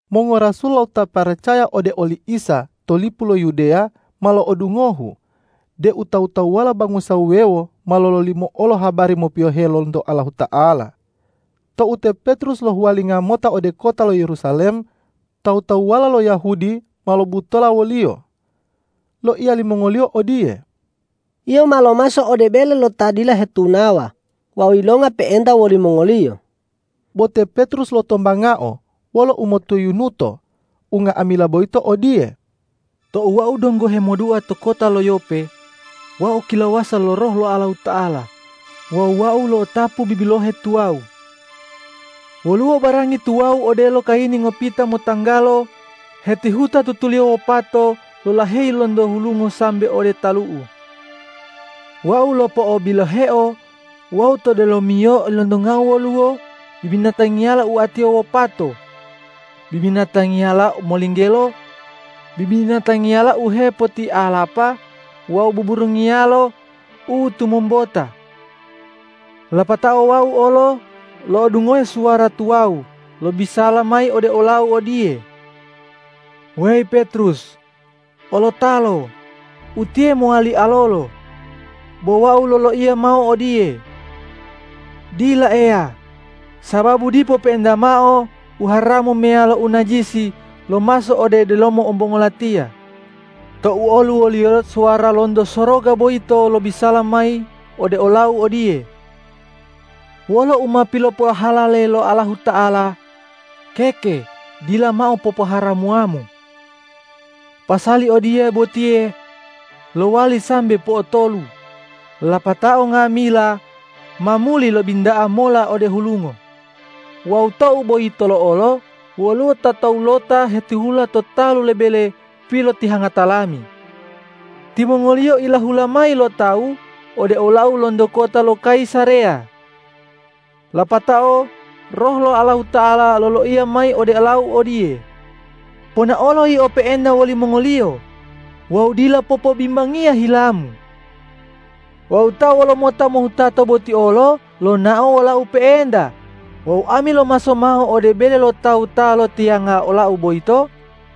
Mongorasul wawu ta paracaya ode oli Isa to lipu lo Yudeya ma lo'odungohu deu tawu-tawuwala bangusa wuwewo ma lololimo olo habari mopiyohe lonto Allahuta'ala. Tou te Petrus lohuwalinga mota ode kota lo Yerusalem, tawu-tawuwala lo Yahudi ma lobutola woliyo. Loiya limongoliyo odiye,”Yio ma lomaso ode bele lo ta dila hetunawa wawu yilonga pe'enta wolimongoliyo!” Bo te Petrus lotombangao wolo umotoyunuto unga'amila boyito odiye, ”Tou wau donggo hemodua to kota lo Yope, wau kilawasa lo Roh lo Allahuta'ala wawu wau lo'otapu bibilohe tuwawu. Woluwo barangi tuwawu odelo kayini ngopita motanggalo hetihuta tutuliyo wopato lolaheyi lonto hulungo sambe ode talu'u. Wau lopo'obiloheo wawu to delomiyo ilontongau woluwo bibinatangiyala oatiyo wopato, bibinatangiyala molinggelo, bibinatangiyala u hepotialapa wawu buburungiyalo u tomombota. Lapatao wau olo lo'odungohe suwara tuwawu lobisala mayi ode olau odiye, ’Weyi Petrus! Olotalo, utiye mowali alolo!’ Bo wau loloiya mao odiye, ’Dila Eya, sababu dipo pe'enta mao u haramu meyalo u najisi lomaso ode delomo ombongo latiya.’ Tou oluwoliyo suwara lonto soroga boyito lobisala mayi ode olau odiye, ’Wolo u ma pilopohalale lo Allahuta'ala, keke dila mao popoharamuwamu!’ Pasali odiye botiye lowali sambe po'otolu, lapatao nga'amila ma muli lobinta'a mola ode hulungo. Wawu tou boyitolo olo woluwo ta towulota hetihula to talu lo bele pilotihangata lami. Timongoliyo ilahula mayi lo tawu ode olau lonto kota lo Kayisareya. Lapatao Roh lo Allahuta'ala loloiya mayi ode olau odiye, ’Ponaolo yio pe'enta wolimongoliyo wawu dila popobimbangiya hilamu!’ Wawu ta wolomota mohutato boti olo lonao wolau pe'enta wawu ami lomaso mao ode bele lo tawu ta loitiyanga olau boyito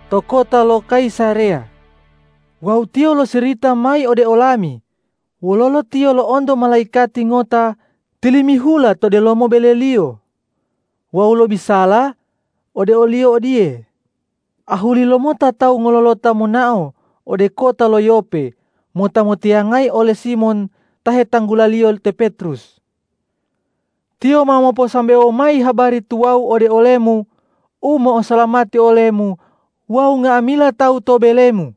to kota lo Kayisareya. Wawu tiyo losirita mayi ode olami, wololo tiyo lo'onto malaikati ngota tilimihula to delomo beleliyo wawu lobisala ode oliyo odiye, ’Ahuli lomota tawu ngololota monao ode kota lo Yope mota motiyangayi ole Simon ta hetanggulaliyo te Petrus. Tiyo ma moposambewo mayi habari tuwawu ode olemu, u mo'osalamati olemu wawu nga'amila tawu to belemu.’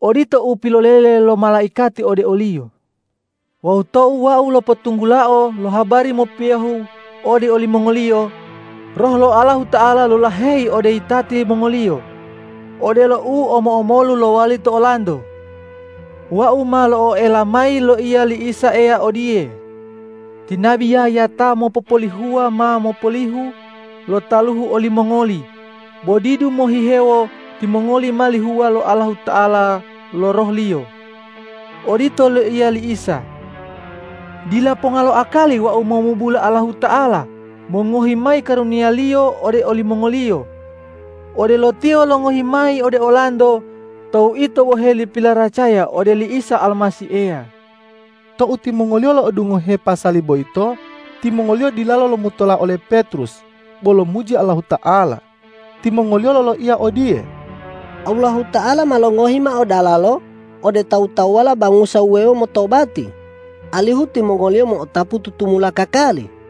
Odito u pilolele lo malaikati ode oliyo. Wawu tou wau lopotunggulao lo habari mopiyohe ode olimongoliyo, Roh lo Allahuta'ala lolaheyi ode yitati mongoliyo, odelo u omo-omolu lowali to olanto. Wau ma lo'oela mayi loiya li Isa Eya odiye, ’Ti nabi Yahya ta mopopolihuwa ma mopolihu lo taluhu olimongoli, bo didu mohihewo timongoli ma lihuwa lo Allahuta'ala lo Roh-Liyo.’ Odito loiya li Isa. Dila ponga lo akali wau momubula Allahuta'ala mongohi mayi karuniya-Liyo ode olimongoliyo, odelo Tiyo longohi mayi ode olanto tou ito boheli pilaracaya ode li Isa Almasih Eya.” Tou timongoliyo lo'odungohe pasali boyito, timongoliyo dilalo lomutola ole Petrus, bo lomuji Allahuta'ala. Timongoliyo loloiya odiye,”Allahuta'ala ma longohi mao dalalo ode tawu-tawuwala bangusa wuwewo motobati, alihu timongoliyo mo'otapu tutumula kakali.”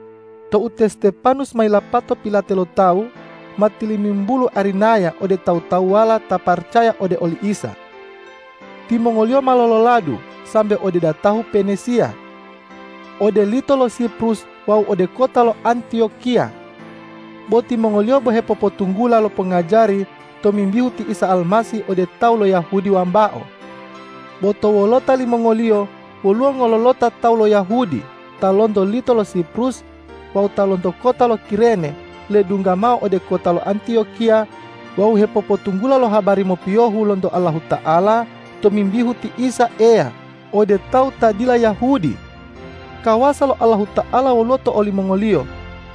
Tou te Stepanus ma yilapato pilate lo tawu, ma tilimimbulu arinaya ode tawu-tawuwala ta paracaya ode oli Isa. Timongoliyo ma lololadu sambe ode datahu Penisiya, ode lito lo Siprus wawu ode kota lo Antiyokiya. Bo timongoliyo bo hepopotunggula lo pongajari tomimbihu ti Isa Almasih ode tawu lo Yahudi wambao. Bo to wolota limongoliyo woluwo ngololota tawu lo Yahudi ta lonto lito lo Siprus wawu ta lonto kota lo Kirene ledungga mao ode kota lo Antiyokiya wawu hepopotunggula lo habari mopiyohu lonto Allahuta'ala tomimbihu ti Isa Eya ode tawu ta dila Yahudi. Kawasa lo Allahuta'ala woluwo to olimongoliyo,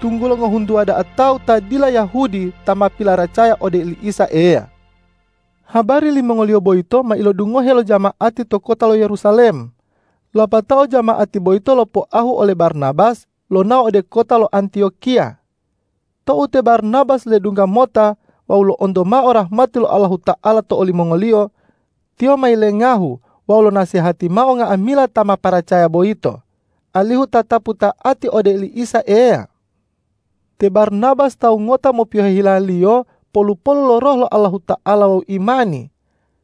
tunggulo ngohuntuwa da'a tawu ta dila Yahudi ta ma pilaracaya ode oli Isa Eya. Habari limongoliyo boyito ma ilodungohe lo jama'ati to kota lo Yerusalem, lapatao jama'ati boyito lopoahu ole Barnabas lonao ode kota lo Antiyokiya. Tou te Barnabas ledungga mota wawu lo'onto mao rahmati lo Allahuta'ala to olimongoliyo, tiyo ma yilengahu wawu lonasehati mao nga'amila ta ma paracaya boyito, alihu tatapu ta'ati ode oli Isa Eya. Te Barnabas tawu ngota mopiyohe hilaliyo, polu-polu lo Roh lo Allahuta'ala wawu imani.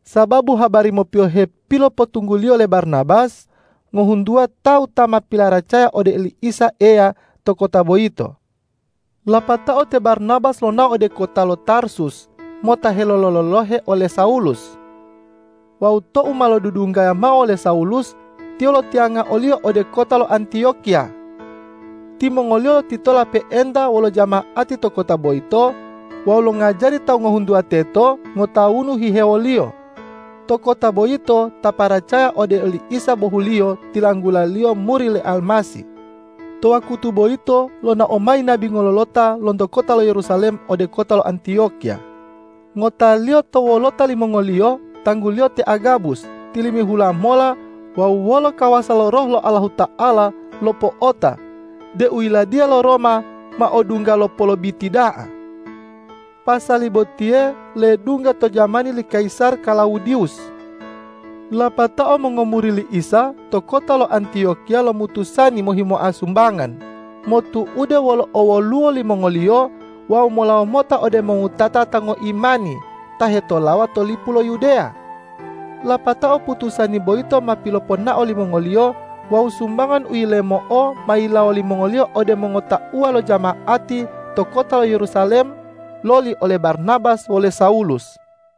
Sababu habari mopiyohe pilopotungguliyo le Barnabas, ngohuntuwa tawu ta ma pilaracaya ode oli Isa Eya to kota boyito. Lapatao te Barnabas lonao ode kota lo Tarsus mota helolo-lolohe ole Sawulus. Wawu tou ma lodudunggaya mao wole Sawulus, tiyo lotiyanga oliyo ode kota lo Antiyokiya. Timongoliyo lotitola pe'enta wolo jama'ati to kota boyito wawu longajari tawu ngohuntuwa teto ngotawunu hihewoliyo. To kota boyito ta paracaya ode oli Isa bohuliyo tilanggulaliyo muri le Almasih. To wakutu boyito lonao mayi nabi ngololota lonto kota lo Yerusalem ode kota lo Antiyokiya. Ngotaliyo to wolota limongoliyo tangguliyo te Agabus tilimihula mola wawu wolo kawasa lo Roh Allahuta'ala lopo'ota deu yiladiya lo Roma ma odungga lo polobiti da'a. Pasali botiye ledungga to jamani li kayisar Klawudiwus. Lapatao mongomuri li Isa to kota lo Antiyokiya lomutusani mohimoa sumbangan, motu'ude wolo owoluwo limongoliyo wawu molawo mota ode mongowutata ta ngoimani ta hetolawa to lipu lo Yudeya. Lapatao putusani boyito ma piloponao limongoliyo wawu sumbangan u yilemo'o ma yilawo limongoliyo ode mongotauwa lo jama'ati to kota lo Yerusalem loli ole Barnabas wole Sawulus.